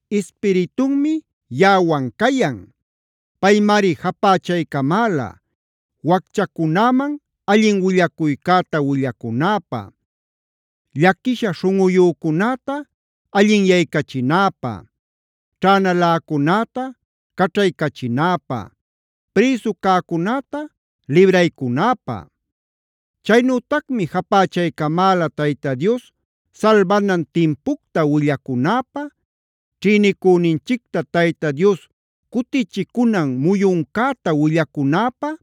Ispiritunmi yaꞌawan cayan. Paymari japächaycamäla: wacchacunäman allin willacuycäta willacunäpä,a llaquisha śhunꞌuyücunäta allinyaycachinäpä, ćhänaläcunäta caćhaycachinäpä, prïsu cäcunäta libraycunäpä. Chaynütacmi japächaycamäla Tayta Dios salbanan timpucta willacunäpä,b ćhïnicüninchicta Tayta Dios cutichicunan muyuncäta willacunäpä,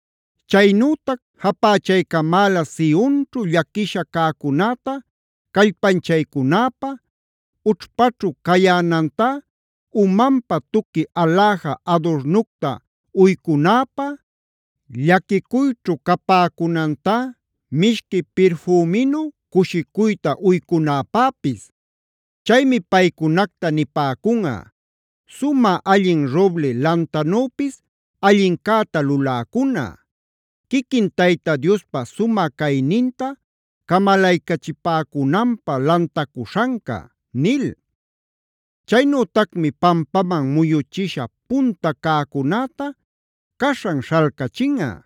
Chaynütac japächaycamäla Sionćhu llaquisha cäcunäta callpanchaycunäpä, ućhpaćhu cayänantá umanpä tuqui aläja adurnucta uycunäpä, llaquicuyćhu capäcunantá mishqui pirfüminu cushicuyta uycunäpäpis. Chaymi paycunacta nipäcunꞌa: “Sumä allin Roble lantanüpis allincäta luläcuna; quiquin Tayta Diospa sumä cayninta camalaycachipäcunanpä lantacuśhanca” nil. Chaynütacmi pampaman muyuchisha punta cäcunäta caśhan śhalcachinꞌa;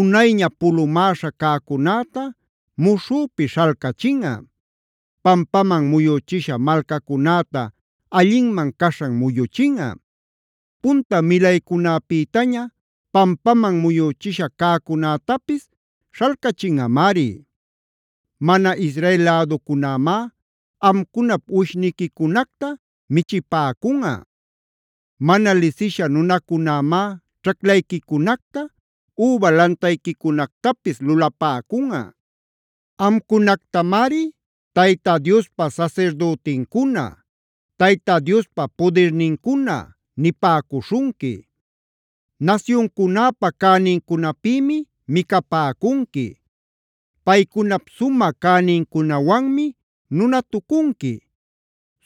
unayña pulumäśha cäcunäta muśhüpi śhalcachinꞌa; pampaman muyüchisha malcacunäta allinman caśhan muyuchinꞌa; punta milaycunäpïtaña pampaman muyüchisha cäcunätapis śhalcachinꞌamari. Mana Israel läducunämá amcunap uwishniquicunacta michipäcunꞌa; mana lisisha nunacunämá ćhaclayquicunacta, üba lantayquicunactapis lulapäcunꞌa. Amcunactamari “Tayta Diospa sasirdütincuna”, “Tayta Diospa pudirnincuna” nipäcuśhunqui. Nasyuncunäpa cänincunapïmi micapäcunqui; paycunap sumä cänincunawanmi nunatucunqui.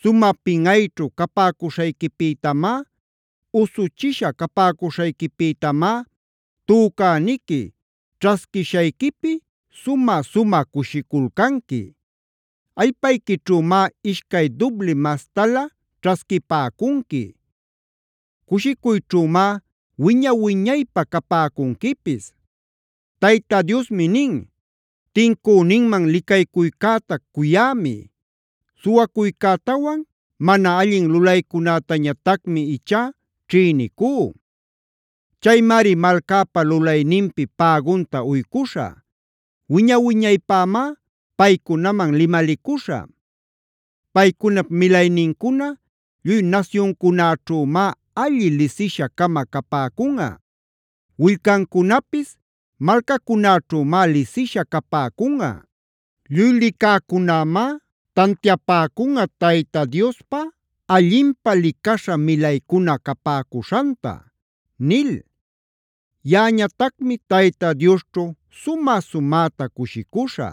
Sumä pinꞌayćhu capäcuśhayquipïtamá, usuchisha capäcuśhayquipïtamá tücäniqui ćhasquishayquipi sumä-sumä cushiculcanqui. Allpayquićhümá ishcay dübli mastalä ćhasquipäcunqui; cushicuyćhümá wiña-wiñaypä capäcunquipis. Tayta Diosmi nin: “Tincüninman licaycuycäta cuyämi. Suwacuycätawan mana allin lulaycunätañatacmi ichá ćhïnicú. Chaymari malcäpa lulayninpi pägunta uycuśhä; wiña-wiñaypämá paycunaman limalicuśhä. Paycunap milaynincuna lluy nasyuncunäćhümá alli lisisha-cama capäcunꞌa; willcancunapis malcacunäćhümá lisisha capäcunꞌa. Lluy licäcunämá tantiapäcunꞌa Tayta Diospa allinpä licaśha milaycuna capäcuśhanta” nil. Yaꞌañatacmi Tayta Diosćhu sumä-sumäta cushicuśhä;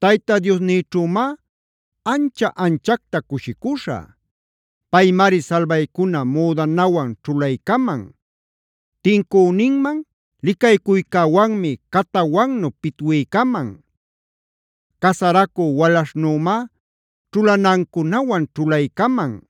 Tayta Diosnïćhümá ancha-anchacta cushicuśhä. Paymari salbaycuna müdanawan ćhulaycaman; tincüninman licaycuycäwanmi catawannu pitwiycaman; casaracü walaśhnümá ćhulanancunawan ćhulaycaman;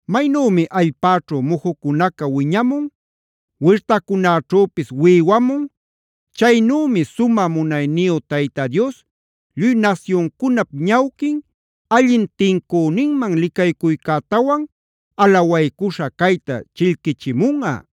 Maynümi allpäćhu mujucunaca wiñamun, wirtacunäćhüpis wïwamun,e chaynümi sumä munayniyu Tayta Dios lluy nasyuncunap ñawquin allin tincüninman licaycuycätawan alawaycuśha cayta chillquichimunꞌa.